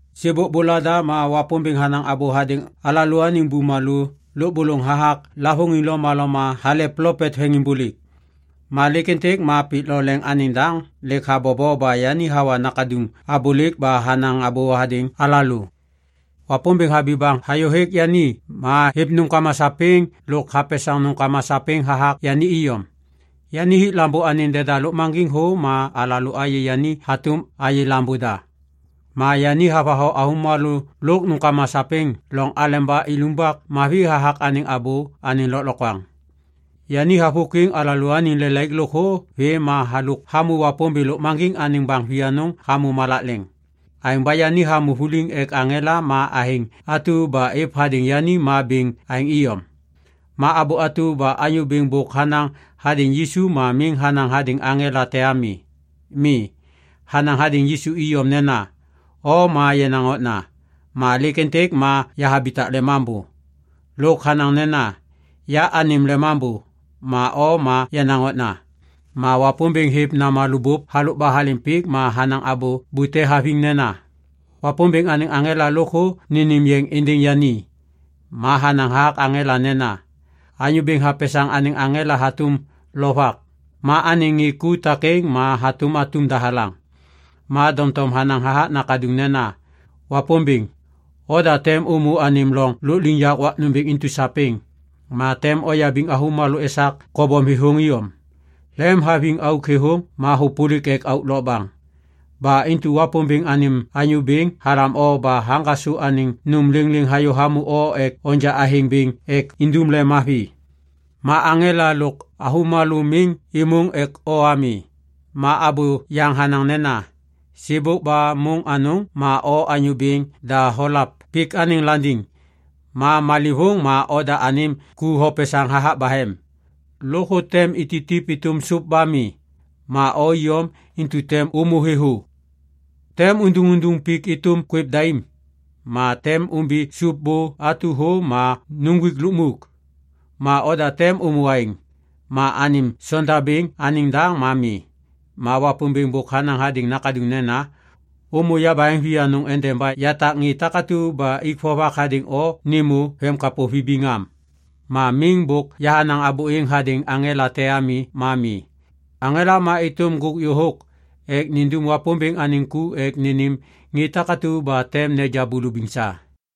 Sêbôk bôlada ma Wapômbêŋ hanaŋ abô hadêŋ alalôaniŋ bumalô lôbôlôŋ hathak lavôŋiŋ lomaloma hale plopet veŋiŋbôlêk. Ma lêk êntêk ma pik lo leŋ anêŋ daŋ lêk habobo ba yani hawa Nakaduŋ abôlêk ba hanaŋ abô hadêŋ alalô. Wapômbêŋ habi baŋ hayô hêk yani ma hêv nômkama sapêŋ lôk hapesaŋ nômkama sapêŋ hathak yani iyom. Yani hik Lambô anêŋ deda lôkmaŋgiŋ thô ma alalô ayê yani hatôm ayê Lambô da. Ma yani havatho avômalô lôk nômkama sapêŋ loŋ aleba ilumbak mavi hathak anêŋ abô anêŋ lôklokwaŋ. Yani havôkwiŋ alalôaniŋ lelaik lôkthô vê ma halôk hamô Wapômbêŋ Lôkmaŋgiŋ anêŋ baŋ vianôŋ hamô malak leŋ. Aêŋ ba yani hamô vuliŋ ek aŋela ma athêŋ atu ba êv hadêŋ yani ma bêŋ aêŋ iyom. Ma abô atu ba Anyô Bêŋ bôk hanaŋ hadêŋ Yisu ma miŋ hanaŋ hadêŋ aŋela te ami. Mi. Hanaŋ hadêŋ Yisu iyom nena, “O ma yenaŋ okna, ma lêk êntêk ma yahabitak lemambô.” Lôk hanaŋ nena, “Ya anêm lemambô, ma o ma yenaŋ okna.” Ma Wapômbêŋ hêv namalô bôp halôk ba halêm pik ma hanaŋ abô bute haviŋ nena, “Wapômbêŋ anêŋ aŋela lôkthô nênêm yeŋ êndêŋ yani.” Ma hanaŋ hathak aŋela nena, “Anyô Bêŋ hapesaŋ anêŋ aŋela hatôm lovak ma anêŋ ŋê ku takêŋ ma hatôm atum dahalaŋ.” Ma doŋtom hanaŋ hathak Nakaduŋ nena, “Wapômbêŋ, oda tem ômô anêm loŋ lôkliŋyak wak nômbêŋ intu sapêŋ, ma tem oyabiŋ avômalô esak kobom thêthôŋ iyom. Lemhaviŋ auk thêthôŋ ma hôpôlik ek auk lokbaŋ. Ba intu Wapômbêŋ anêm Anyô Bêŋ halam o ba haŋgasô anêŋ nôm lêŋlêŋ hayô hamô o ek onja athêŋ bêŋ ek indum lemmavi. Ma aŋela lôk avômalô miŋ êmôŋ ek o ami.” Ma abô yaŋ hanaŋ nena, “Sêbôk ba môŋ anôŋ ma O Anyô Bêŋ da holav pik anêŋ landiŋ, ma leŋlêvôŋ ma oda anêm ku hopesaŋ hathak bahem. Lôkthô tem ititip êtôm sôp ba mi. Ma o iyom intu tem ômô thêthô. Tem unduŋunduŋ pik êtôm kwêv daim, ma tem ômbi sôp bô atu thô ma nuŋgwik lukmuk. Ma oda tem ômô aêŋ, ma anêm sondabêŋ anêŋ daŋ ma mi.” Ma Wapômbêŋ bôk hanaŋ hadêŋ Nakaduŋ nena, “Ômô yabaheŋ vianôŋ endeba yatak ŋê takatu ba ik vovak hadêŋ o nêmô vemkapô vibiŋ am.” Ma miŋ bôk hanaŋ abô êŋ hadêŋ aŋela te ami ma mi. Aŋela ma êtôm ŋgôk yôhôk ek nindum Wapômbêŋ anêŋ ku ek nênêm ŋê takatu ba tem neja bulubiŋ sa.